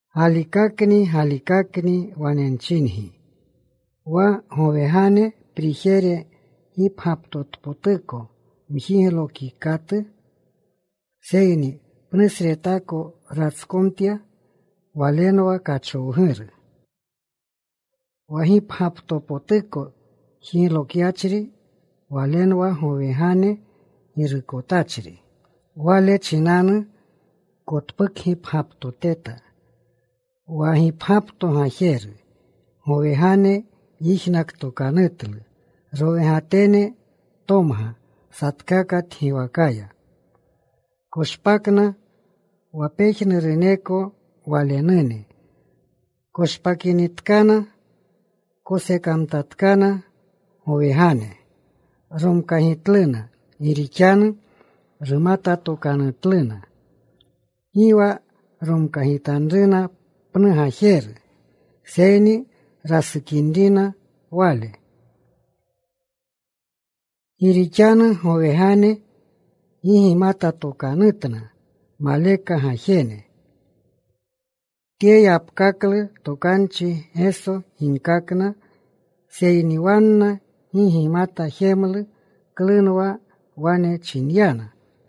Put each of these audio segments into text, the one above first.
“Galikakni, galikakni, wane nchingi, wa gowegane prijere gipgyaptotpotuko mjiglokikatu, seyni pnusretako ratskomtya, walenwa kachowguru. Wa gipgyaptopotuko jiglokyachri, Walenwa gowegane girukotachri. Wale chinanu kotpukgipgyaptoteta wa gipgyapto gajeru. Gowegane yijnaktokanutlu. Rowegatene tomga satkaka tgiwakaya. Koshpakna. Wa pejnuruneko Walenune koshpakinitkana, kosekamtatkana. Gowegane gomkagitlu gi rixanu rumatatokanutluna. Gi wa romkagitanruna pnu gajeru, seyni rasukinrina wale, gi rixanu gowegane gi gimatatokanutna maleka gajene.” Tye yapkaklu tokanchi Geso ginkakna, seyni wanna gi gimata jemlu klunwa wane chinyana.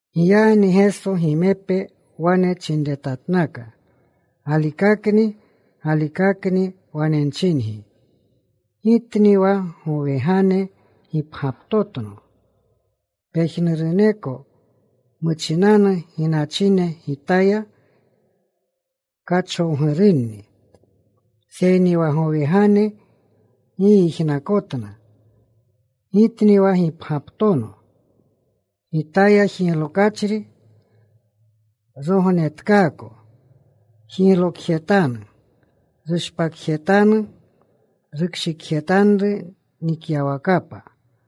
Giyagni Geso gimepe wane chinretatnaka, “Galikakni, galikakni wane nchingi, Gitni wa gowegane gipgyaptotno. Pejnuruneko muchinanu ginachine Gitaya kachowgurunni, seyni wa gowegane gi yijnakotna. Gitni wa gipgyaptono. Gitaya jiglokyachri rognetkaako. Jiglokjetanu. Rushpakjetanu. Rukshikjetanru nikyawakapa.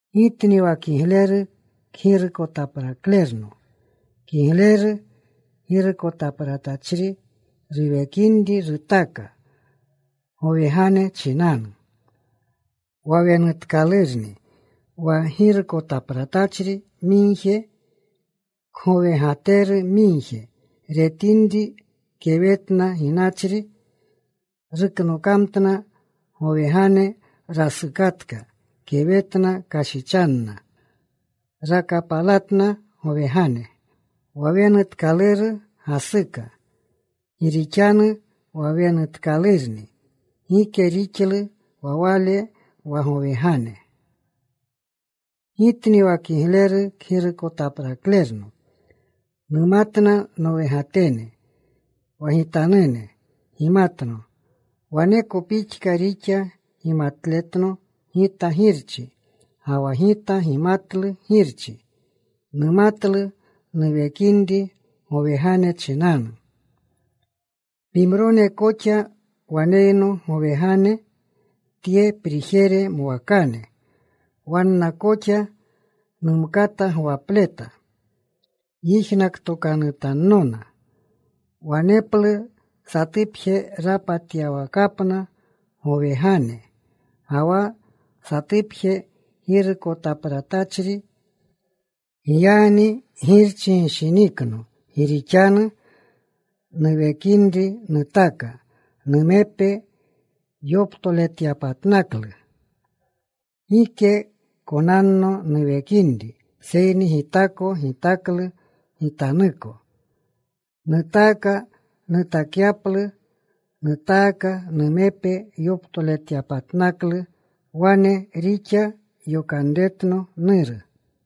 “Gitni wa kigleru kgirukotapraklerno. Kigleru girukotapratachri ruwekinri rutaka gowegane chinanu. Wa wenutkalurni, wa girukotapratachri migje, kgowegateru migje, retapinri kewetna ginachri, ruknokamtna gowegane. Rasukatka. Kewetna kashichanna. Rakapalatna gowegane. Wa wenutkaluru gasuka gi rixanu wa wenutkalurni. Gike rixluna wa wale wa gowegane. “Gitni wa kigleru kgirukotapraklerno. Numatna nowegatene. Wa Gitanune gimatno. Waneko pixka rixa gimatletno Gita Girchi, ga wa Gita gimatlu Girchi. Nutaklu nuwekinri gowegane chinanu. Pimrone koxa waneyno gowegane, tye prijere mwakane. Wanna koxa numkata gwapleta. Yijnaktokanutannona. Waneplu satupje rapatyawakapna gowegane, ga wa satupje girukotapratachri. Giyagni Girchi gishinikno gi rixanu nuwekinri nutaka numepe yoptoletyapatnaklu. Gike konanno nuwekinri, seyni Gitako gitaklu Gitanuko. Nutaaka nutakyaplu. Nutaaka numepe yoptoletyapatnaklu. Wane rixa yokanretno Nuru.”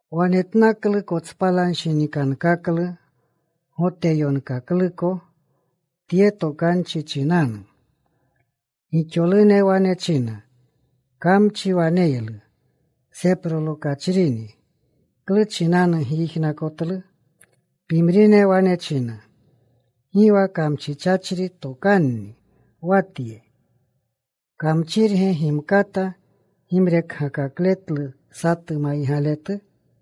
Wanetnaklu kotspalanshinikankaklu Goteyonkakluko tye tokanchi chinanu. Gixolune wane china, “Kamchi waneylu. Seprolokachrini. ¿Klu chinanu gyijnakotlu?” Pimrine wane china, “Gi wa kamchichachri tokanni wa tye. ¿Kamchirge gimkata gimrekgakakletlu satu maygaletu?”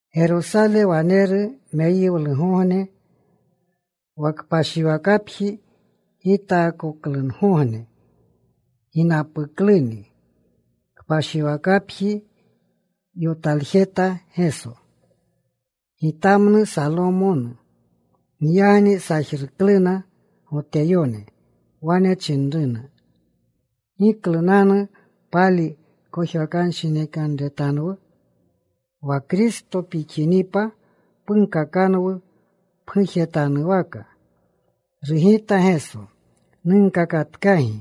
Gerosale waneru meyiwlugogne, wa kpashiwakapji gitaakoklungogne. Ginapukluni. Kpashiwakapji yotaljeta Geso, gitamnu Salomonu. Giyagni sajrukluna Goteyone. Wane chinruna, “¿Giklunanu pali kojwakanshinikanretanwu? Wa Kristo pixinipa, punkakanwu pgujetanwaka.” Rugitna Geso, “Nunkakatkagi.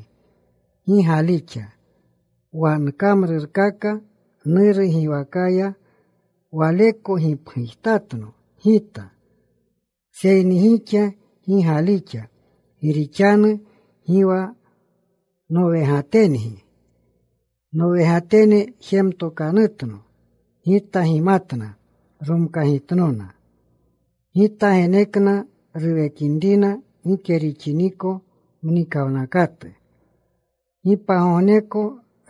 Gi galixa. Wa nkamrurkaka Nuru giwakaya, waleko gipgujtatno Gita. Seyni gixa gi galixa gi rixanu gi wa nowegatengi. Nowegatene jematokanutno. Gita gimatna. Romkagitnona. Gita genekna ruwekinrina gike rixiniko mnikawnakatu. Gi pagogneko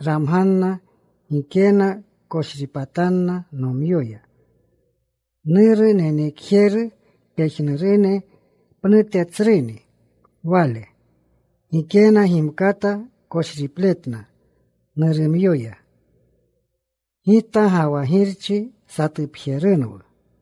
ramganna. Gikena koshripatanna nomyoya. Nuru, nenekjeru, pejnurune pnute tsruni Wale. Gikena gimkata koshripletna Nurumyoya. Gita ga wa Girchi satupjerunwu.”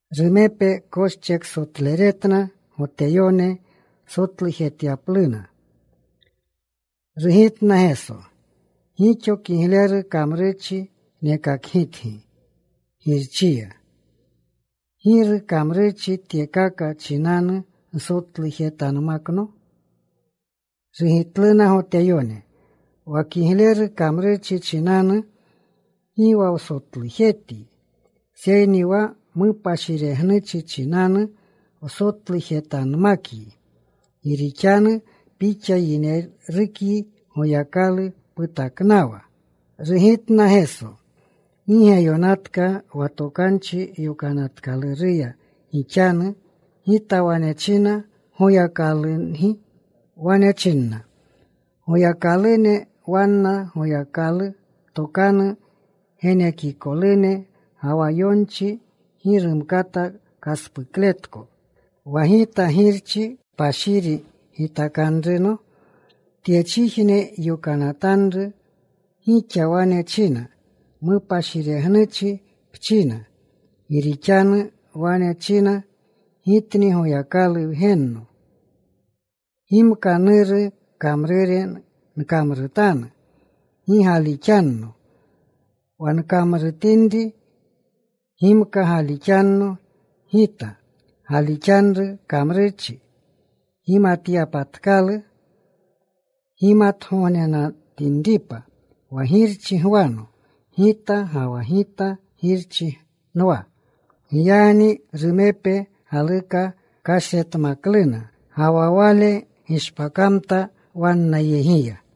Rumepe koscheksotleretna Goteyone sotlujetyapluna. Rugitna Geso, “Gixo kigleru kamrurchi nekakgitgi Girchiya. ¿Giru kamrurchi tyekaka chinanu nsotlujetanmakno?” Rugitluna Goteyone, “Wa kigleru kamrurchi chinanu, gi wa wsotlujetyi, seyni wa mupashiregnuchi chinanu wsotlujetanmakyi, gi rixanu Pixa yinerukyi Goyakalu putaknawa.” Rugitna Geso, “¿Gi ge yonatka wa Tokanchi Yokanatkaluruya gixanu: Gita wane china, goyakalungi? “Wane chininna goyakalune wanna Goyakalu tokanu genekikolune, ga wa yonchi gi rumkata kaspukletko, wa Gita Girchi kpashiri gitakanruno, tyechijne yokanatanru, gixa wane china, ‘Mupashiregnuchi pchina,’ gi rixanu wane nchina, ‘Gitni Goyakalu Wgenno.’ Gimka Nuru kamrure nkamrutanu, gi galixanno. Wa nkamrutinri, gimka galixanno Gita, galixanru kamrurchi, gimatyapatkalu, gimatgognenatinripa wa Girchi gwano Gita, ga wa Gita Girchi nwa.” Giyagni rumepe galuka kashretmakluna, ga wa Wale gishpakamta wannayegiya.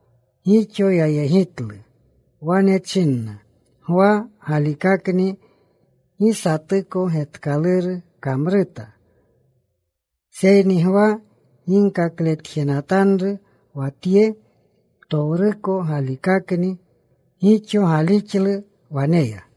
Gixo yayegitlu. Wane chinna, “Gwa galikakni gi satuko getkaluru kamruta. Seyni Gwa ginkakletjenatanru wa Tye ptowruko galikakni.” Gixo galixlu waneya.